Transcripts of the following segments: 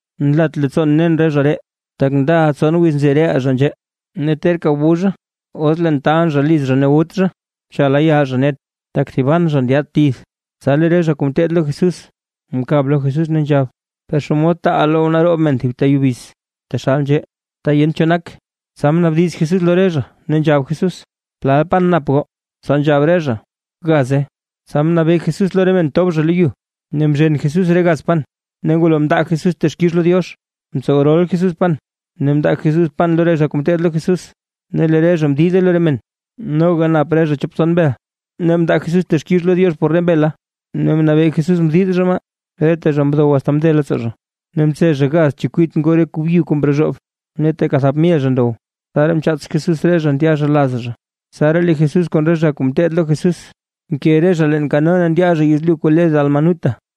―Nlat leettsoon nen re zha ree, tak ndaʼa tson wiz nzi reʼaa nzhee, ne terka wu zha. Os leen taalʼn zha liz zha ne wut zha, cha layaal zha net, tak thiban zha ndyaad tith. Tsa lee re zha kuu ngeteed lo Jesús, mkab lo Jesús ne nzhab: ―¿Per xomod taaʼaa loww naroob men thib ta yubiz, taxal nzhee, ta yent cho nak? Tsa mnaabdiz Jesús lo re zha, ne nzhab Jesús: ―¿Plal pan nap goo? Tsa nzhab re zha: ―Gaze. Tsa mnabee Jesús lo re men tob zha lo yu, ne mzhen Jesús re gaz pan ne ngwalo mndaa Jesús texkix lo Diox, mtsow rol Jesús pan ne mndaa Jesús pan lo re zha kuu ngeteed lo Jesús, ne lee re zha mdide lo re men. Noga nap re zha chop tson mbel; ne mndaa Jesús texkix lo Diox por re mbela ne mnabee Jesús mdid zha maa. Reta zha ndow asta mze leettsoo zha, ne mtse zha gaz chekwit ngoo re kuu byu kuu mrozhoob. Ne teeka thap mil zha ndow, tsaraa mchaats Jesús re zha ndya zha laz zha. Tsaraa lee Jesús kon re zha kuu ngeteed lo Jesús, mke re zha leen kano ne ndya zha yezlyu kuu le Dalmanuta.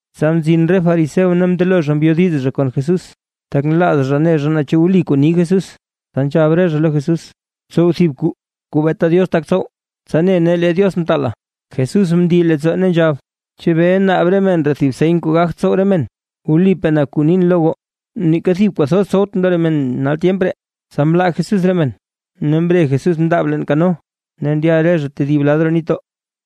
Tsa mzin re fariseo ne mndelo zha mbyodiz zha kon Jesús, tak nlaaz zha ne zha naa chu wli kuu ni Jesús. Tsa nzhab re zha lo Jesús: ―Tsow thib kwaa kuu beeta Diox tak tsow, tsa ne nee lee Diox mtaala. Jesús mndii leettsoo ne nzhab: ―¿Chebee naab re men ree thib seny kuu gagt tsow re men? Wlipaa na kuu nin lo goo, neeka thib kuu thoz tsowtʼn lo re men nal tyemp ree. Tsa mlaa Jesús re men, ne mre Jesús mndaab leen kano ne ndya re zha tedib lad roo nitdoo.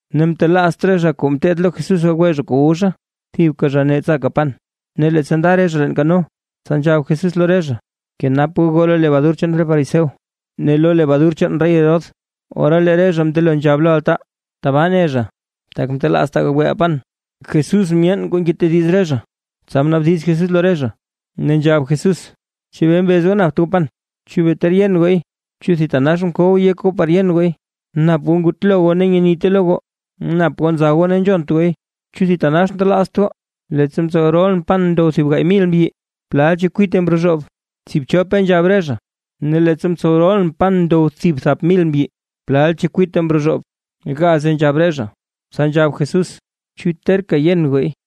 Ne mtelaazt re zha kuu ngeteed lo Jesús gagwe zha kuu wu zha, thibka zha ne tsaka pan. Ne leettsa nda re zha leen kano, tsa nzhab Jesús lo re zha: ―Bkenap goo goo lo lebadur chaan re fariseo ne lo lebadur chaan rey Herodes. Ora lee re zha mndelo nzhab lo altaa: ―Tbaa ne zha, tak mtelaaztaa gagweʼaa pan. Jesús myeen kuu ngetediz re zha, tsa mnaabdiz Jesús lo re zha, ne nzhab Jesús: ―¿Chebee mbez goo napt goo pan? ¿Chu bee ter yen gooy? ¿Chu thitanax mkow yek goo par yen gooy? ¿Nap goo ngutlo goo ne nyenite lo goo, nap goo nza goo ne nzhont gooy? ¿Chu thitanax ntelaazt goo? Leettsa mtsow rolʼn pan ndow thib gaay mil mbyi, ¿plal chekwite mrozhoob? ―Tsiibchope ―nzhab re zha. ―Ne leettsa mtsow rolʼn pan ndow thib thap mil mbyi, ¿plal chekwite mrozhoob? ―Gaze ―nzhab re zha. Tsa nzhab Jesús: ―¿Chu terka yen gooy?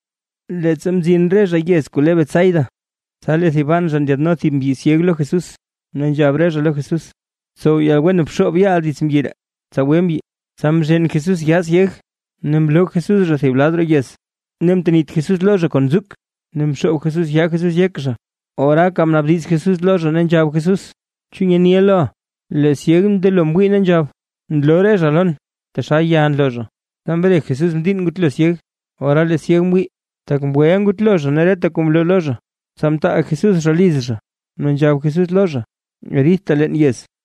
Leettsa mzin re zha yez kuu le Betsaida, tsa lee thiban zha ndyaadno thib mbyi syeg lo Jesús, ne nzhab re zha lo Jesús: ―Tsow yalwen bxoob yaaʼa dits mbyi ree, tsa gwe mbyi. Tsa mzhen Jesús yaa syeg ne mloo Jesús zha thib lad roo yez, ne mtenit Jesús lo zha kon nzuk, ne mxoob Jesús yaa Jesús yek zha, oraaka mnaabdiz Jesús lo zha, ne nzhab Jesús: ―¿Chu nyeniʼa loʼa? Lee syeg mndelo mwii ne nzhab: ―Nloo re zha lon, taxal ya nloo zha. Tsa mre Jesús mdiinn ngutlo syeg, ¡ora lee syeg mwii, tak mgweʼa ngutlo zha ne reta kuu mloo lo zha! Tsa mtaal Jesús zha liz zha, ne nzhab Jesús lo zha: ―Ridta leen yez.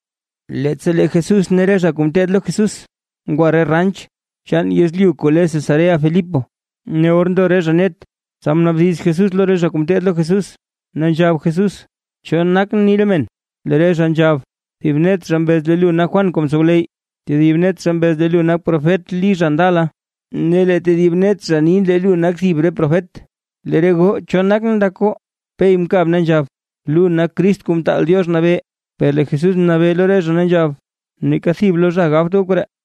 Leettsa lee Jesús ne re zha kuu ngeteed lo Jesús, ngwa re ranch chaan yezlyu kuu le Cesarea-Filipo. Ne or ndo re zha net, tsa mnaabdiz Jesús lo re zha kuu ngeteed lo Jesús, ne nzhab Jesús: ―¿Cho nakʼn ni re men? Lee re zha nzhab: ―Thib net zha mbez lee lu nak Juan kuu mtsowleyy, tedib net zha mbez lee lu nak profet Lí zha ndala, ne lee tedib net zha ni lee lu nak thib re profet. ―Lee re goo, ¿cho nakʼn ndak goo? Pey mkab ne nzhab: ―Lu nak Crist Kuu Mtaal Diox Nabee. Per lee Jesús mnabee lo re zha ne nzhab: ―Neeka thib lo zha gabt goo koree.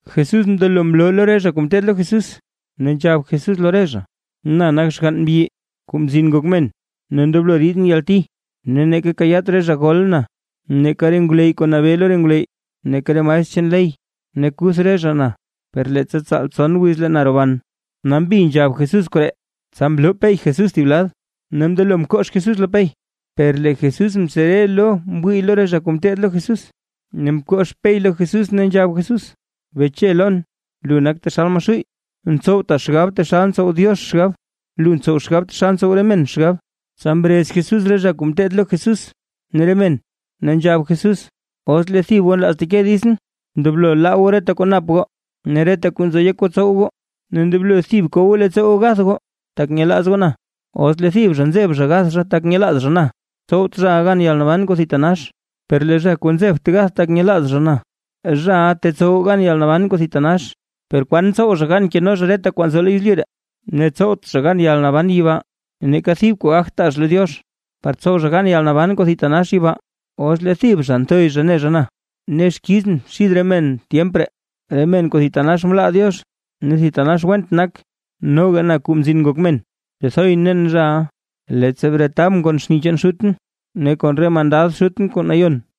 Jesús mndelo mloo lo re zha kuu ngeteed lo Jesús, ne nzhab Jesús lo re zha: ―Na nak xgann mbyi, Kuu Mzin Ngok Men, ne ndoblo ridʼn yalti, ne neeka kayaat re zha gol na neeka re ngwleyy kuu nabee lo re ngwleyy, neeka re maestr chaan ley. Ne kuth re zha na, per leettsa tsaal tson wiz lee na roban. Nambi nzhab Jesús koree. Tsa mloo Pey Jesús thib lad, ne mndelo mkox Jesús lo Pey. Per lee Jesús mtsere lo mwii lo re zha kuu ngeteed lo Jesús, ne mkox Pey lo Jesús ne nzhab Jesús: ―¡Beche lon, lu nak taxal Maxuuy! Ntsowta xgab taxal ntsow Diox xgab; lu ntsow xgab taxal ntsow re men xgab. Tsa mrez Jesús re zha kuu ngeteed lo Jesús ne re men, ne nzhab Jesús: ―Os lee thib goo nlaaz teke ditsʼn, ndoblo laa goo reta kuu nap goo, ne reta kuu nzo yek goo tsow goo, ne ndoblo thib ko goo leettsoo goo gath goo, tak nyelaaz goo na. Os lee thib zha nzeb zha gath zha, tak nyelaaz zha na, tsowt zhaʼa gan yalnaban kuu thitanax. Per lee zha kuu nzebt gath, tak nyelaaz zha na, zhaʼa tetsow gan yalnaban kuu thitanax. Per kwan tsow zha gan keno zha reta kwaa nzo yezlyu ree, ne tsowt zha gan yalnaban yibaa. Neeka thib kwaa gagt taa zha lo Diox, par tsow zha gan yalnaban kuu thitanax yibaa. Os lee thib zha nthoy zha ne zha na ne xkizʼn xid re men tyemp ree, re men kuu thitanax mlaa Diox ne thitanax went nak, noga na Kuu Mzin Ngok Men, tethoyʼn nen zhaʼa, leettsa bretabʼn kon xni chaan Xutʼn ne kon re mandad Xutʼn kuu nayon.